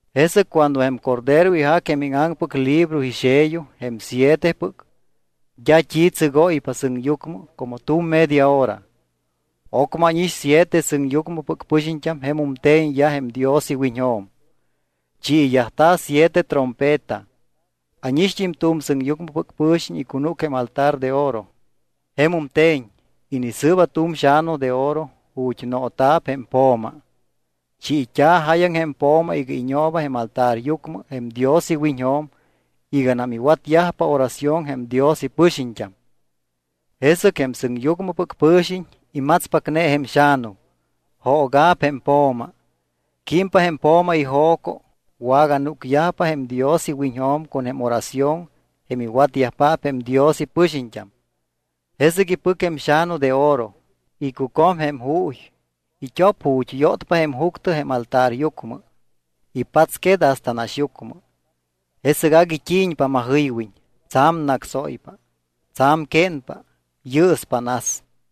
Jesɨc cuando jém Cordero ijac jém íŋaŋpɨc libro ixello, jém sietepɨc, d́a t́i tsɨgóypa sɨŋyucmɨ como tu̱m media hora. Ocmɨ ánix siete sɨŋyucmɨpɨc pɨxiñt́am jemum te̱ñyaj jém Dios iwiñjo̱m. Chiiyajta̱ siete trompeta. Ánixt́im tu̱m sɨŋyucmɨpɨc pɨ̱xiñ icunúc jém altar de oro, jemum te̱ñ. Inisɨɨba tu̱m xa̱nu de oro ju̱t́ noota̱p jém po̱ma. Chiit́a̱ jáyaŋ jém po̱ma iga iñooba jém altaryucmɨ jém Dios iwiñjo̱m iganam iwatyajpa oración jém Dios ipɨxiñt́am. Jesɨc jém sɨŋyucmɨpɨc pɨ̱xiñ imatspacne jém xa̱nu. Jooga̱p jém po̱ma. Químpa jém po̱ma ijo̱co, waganúcyajpa jém Dios iwiñjo̱m con jém oración jém iwatyajpaap jém Dios ipɨxiñt́am. Jesɨc ipɨc jém xa̱nu de oro, icucom jém juuy. It́op ju̱t́ yótpa jém juctɨ jém altaryucmɨ, ipatsquet hasta naxyucmɨ. Jesɨc agui t́i̱ñpa majɨywiñ, tsa̱m nácsóypa, tsa̱m quénpa. Yɨɨspa nas.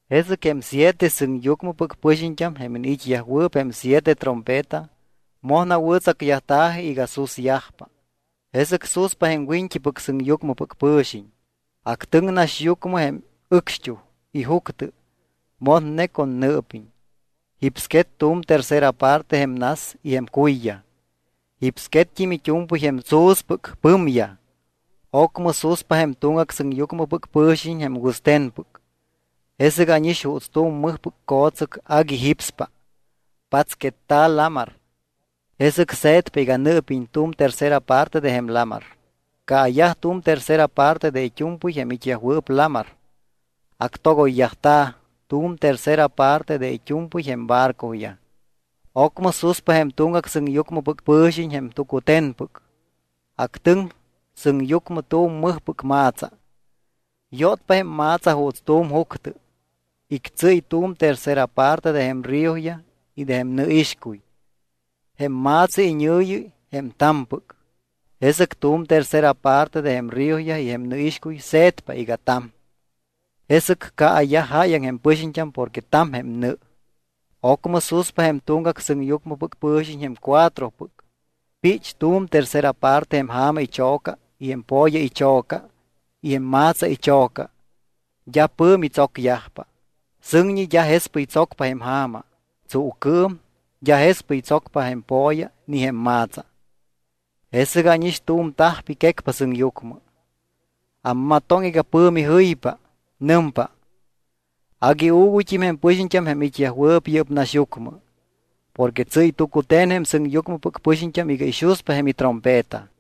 Jesɨc jém siete sɨŋyucmɨpɨc pɨxiñt́am jém iniit́yajwɨɨp jém siete trompeta moj nawɨ̱tsacyajta̱ji iga susyajpa. Jesɨc suspa jém wiñt́ipɨc sɨŋyucmɨpɨc pɨ̱xiñ, actɨŋ naxyucmɨ jém ɨcxt́uj y juctɨ motne con nɨɨpiñ. Jipsquet tu̱m tercera parte jém nas y jém cuyyaj. Jipsquett́im it́u̱mpɨy jém tsu̱spɨc pɨmyaj. Ocmɨ suspa jém tuŋgac sɨŋyucmɨpɨc pɨ̱xiñ jém wɨste̱npɨc. Jesɨc ánix juuts tu̱m mɨjpɨc co̱tsɨc agui jípspa, patsquetta̱ lamar. Jesɨc se̱tpa iga nɨɨpiñ tu̱m tercera parte de jém lamar. Caayaj tu̱m tercera parte de it́u̱mpɨy jém it́yajwɨɨp lamar. Actogoyyajta̱ tu̱m tercera parte de it́u̱mpɨy jém barcoyaj. Ocmɨ suspa jém tuŋgac sɨŋyucmɨpɨc pɨ̱xiñ jém tucute̱npɨc. Actɨŋ sɨŋyucmɨ tu̱m mɨjpɨc ma̱tsa. Yótpa jém ma̱tsa juuts tu̱m juctɨ. Ictsɨ́y tu̱m tercera parte de jém ríoyaj y de jém nɨixcuy. Jém ma̱tsa iñɨ̱yi jém ta̱mpɨc. Jesɨc tu̱m tercera parte de jém ríoyaj y jém nɨixcuy se̱tpa iga ta̱m. Jesɨc caayaj jáyaŋ jém pɨxiñt́am porque ta̱m jém nɨ. Ocmɨ suspa jém tuŋgac sɨŋyucmɨpɨc pɨ̱xiñ jém cuatropɨc. Pích tu̱m tercera parte jém ja̱ma icho̱ca y jém po̱ya icho̱ca y jém ma̱tsa icho̱ca. D́a pɨ̱mi tsocyajpa. Sɨŋñi d́a jespɨy tsocpa jém ja̱ma. Tsuucɨɨm d́a jespɨy tsocpa jém po̱ya ni jém ma̱tsa. Jesɨc ánix tu̱m tajpi quécpa sɨŋyucmɨ. Ammatoŋ iga pɨ̱mi jɨypa. Nɨmpa: —Agui uuguyt́im jém pɨxiñt́am jém it́yajwɨɨp yɨ́p naxyucmɨ. Porque tsɨ́y tucute̱n jém sɨŋyucmɨpɨc pɨxiñt́am iga ixuspa jém itrompeta.